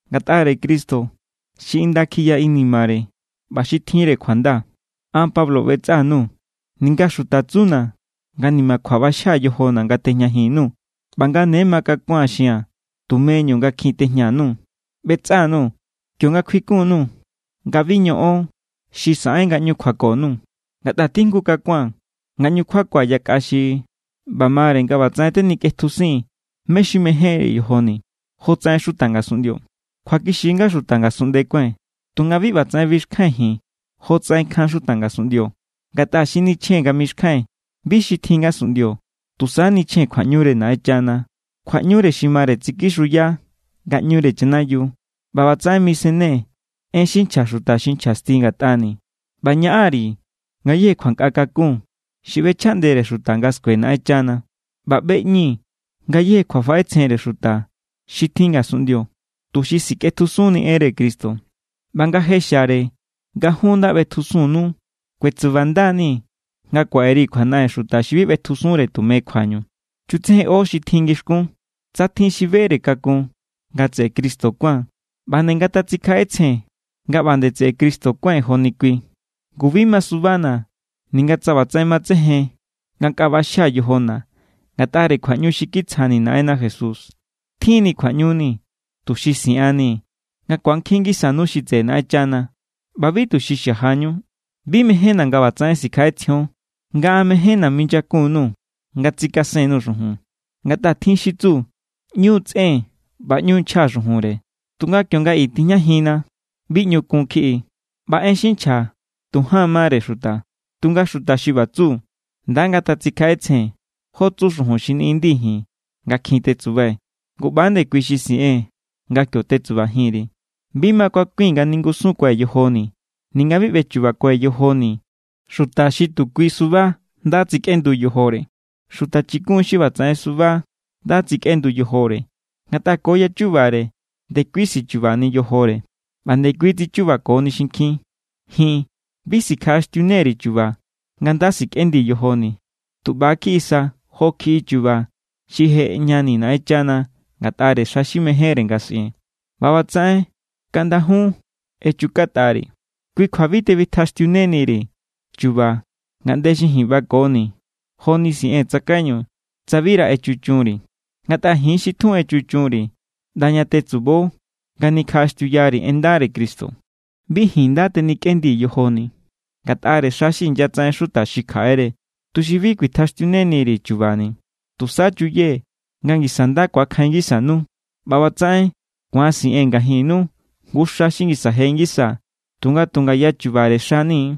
Ngatꞌare Cristo xi inda kjiya inimare ꞌba xi tjinre kjuanda an Pablo ꞌbetsꞌa_nuu̱, ninga xuta tsuna̱ nga nimakjua ꞌbaxjia̱ yojona̱ nga tejñajin_nuu̱ ꞌba nga ne makakua̱n xia̱n tumeñu nga kjin tejña_nuu̱. ꞌBetsꞌa_nuu̱ kionga kjuikun_nuu̱ nga bi ñoꞌon xi saꞌen nga ꞌñu kjuako_nuu̱. Ngatꞌa tjijngu kakua̱n nga ꞌñu kjuakua̱ yakꞌa xi ꞌba mare nga ꞌbatsaꞌen tenikꞌetjusii̱n mé= xi mejénre yojoni̱ jotsaꞌen xuta ngasunꞌndio. Kjuakixi= nga xuta ngasunꞌnde kuái̱n, tunga bi ꞌbatsaꞌen bixkjai̱n ji̱n jotsaꞌen kjan xuta ngasunꞌndio. Ngatꞌa xi nichjee̱n nga mixkjai̱n bi xi tjin ngasunꞌndio. Tusa nichjee̱n kjuaꞌñure Naꞌenchana, kjuaꞌñu xi mare tsikixuya ngaꞌñure chanayiu. ꞌBa ꞌbatsaꞌen misennee̱ en xi nchja xuta xi nchjasti ngatꞌani̱. ꞌBa ñaꞌan_ri̱ ngayéje kjuankꞌa kakun xi ꞌbechjaꞌndere xuta nga skue Naꞌenchana, ꞌba ꞌbeꞌñii̱ ngayéje kjuafaꞌetsjenre xuta xi tjin ngasunꞌndio tuxi sikꞌetjusunni enre Cristo. ꞌBa nga je xiare nga jun nda ꞌbetjusunnu, kuetsubanda=nii̱ nga kuaꞌe_ri̱ kjuanaꞌen xuta xi bi ꞌbetjusunre tume kjuañu. Chutsejenꞌo xi tjin ngixkún. Tsa tjin xi bere kakun nga tseꞌe Cristo kuán, ꞌba nde ngatatsikjaꞌetsjen nga ꞌba nde tseꞌe Cristo kuái̱n joni kui. Ngu bi masubana̱ ninga tsa ꞌbatsaꞌen matsejen nga nkꞌa ꞌbaxjia̱ yojona̱ ngatꞌare kjuaꞌñu xi kitsjani̱ Naꞌenna Jesús. Tjinni̱ kjuaꞌñuni tuxi siꞌannii̱ nga ku̱ankjin ngisanu xi tseꞌe Naꞌenchana, ꞌba bi tuxi xajañu. Bi mejénna̱ nga ꞌbatsaꞌen sikjaꞌetsjion nga an mejénna̱ minyakun_nuu̱ nga tsikasen_nuu̱ xujun. Ngatꞌa tjin xi tsu: ꞌÑu tsꞌen ꞌba ꞌñu nchja xujunre, tunga kionga i tijñajinna bi ꞌñu kun kjiꞌi. ꞌBa en xi nchja tu jaan mare xuta. Tunga xuta xi ꞌba tsu, nda ngatatsikjaꞌetsjen jo tsu xujun xi niꞌindii̱ ji̱n nga kjin tetsubai̱. Ngu ꞌba=nde kui xi siꞌee̱n nga kio tetsubajin_ri̱. Bi makakui̱n nga ningusunkuai̱ yojoni̱ ninga bi ꞌbechubakue̱ yojoni̱ xuta xi tu kui suba nda tsikꞌendu yojore. Xuta chikun= xi ꞌbatsaꞌen suba nda tsikꞌendu yojore, ngatꞌa ko yachubare ndekui tsichubani yojore, ꞌba ndekui tsichubakoni xinkjin. Ji̱n, bi sikjaꞌaxtiune_ri̱ chu̱ba̱ nga nda sikꞌendii̱ yojoni̱. Tu ꞌba= kjiꞌi sa jo kjiꞌi chu̱ba̱ xi je ꞌejñani̱ Naꞌenchana ngatꞌare xa xi mejénre nga siꞌee̱n. ꞌBa ꞌbatsaꞌen kaꞌnda jun echukatꞌari̱. Kui kjua bi tebitjaxtiuneni_ri̱ chu̱ba̱ ngaꞌnde xi ji̱n ꞌbakoni̱ joni siꞌee̱n tsakaiñu tsa bira echuchunri̱. Ngatꞌa ji̱n= xi tjun echuchunri̱ ꞌnda ña tetsubo nga nikjaꞌaxtiuyari̱ en ndare Cristo. Bi ji̱n nda tenikꞌendii̱ yojoni̱ ngatꞌare xa xi inyatsaꞌen xuta xi kjaꞌere, tuxi bi kuitjaxtiuneni_ri̱ chu̱ba̱ni̱. Tusa chuyee̱ nga ngisa nda ku̱akjain ngisanu, ꞌba ꞌbatsaꞌen ku̱an siꞌee̱n ngajinnu jngu xa xi ngisa je ngisa, tunga tu ngaya chubare xani̱.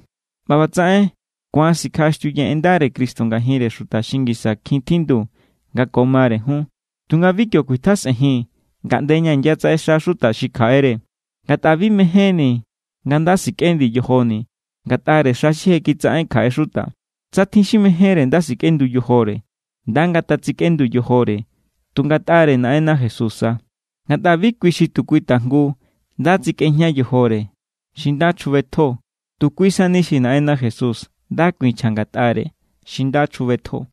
ꞌBa ꞌbatsaꞌen ku̱an sikjaꞌaxtiuyee̱ en ndare Cristo ngajinre xuta xi ngisa kjin tjindu nga ko mare jun, tunga bi kio kuitjesꞌenjii̱n ngaꞌnde ña inyatsaꞌexa xuta xi kjaꞌere. Ngatꞌa bi mejénni̱ nga nda sikꞌendii̱ yojoni̱ ngatꞌare xa xi je kitsaꞌen kjaꞌe xuta. Tsa tjin xi mejénre nda sikꞌendu yojore, nda ngatatsikꞌendu yojore tu ngatꞌare Naꞌenna Jesús sa. Ngatꞌa bi kui xi tu kui tajngu nda tsikꞌejña yojore xi nda chjubetjo. Tu kui sani xi Naꞌenna Jesús nda kuinchja ngatꞌare xi nda chjubetjo.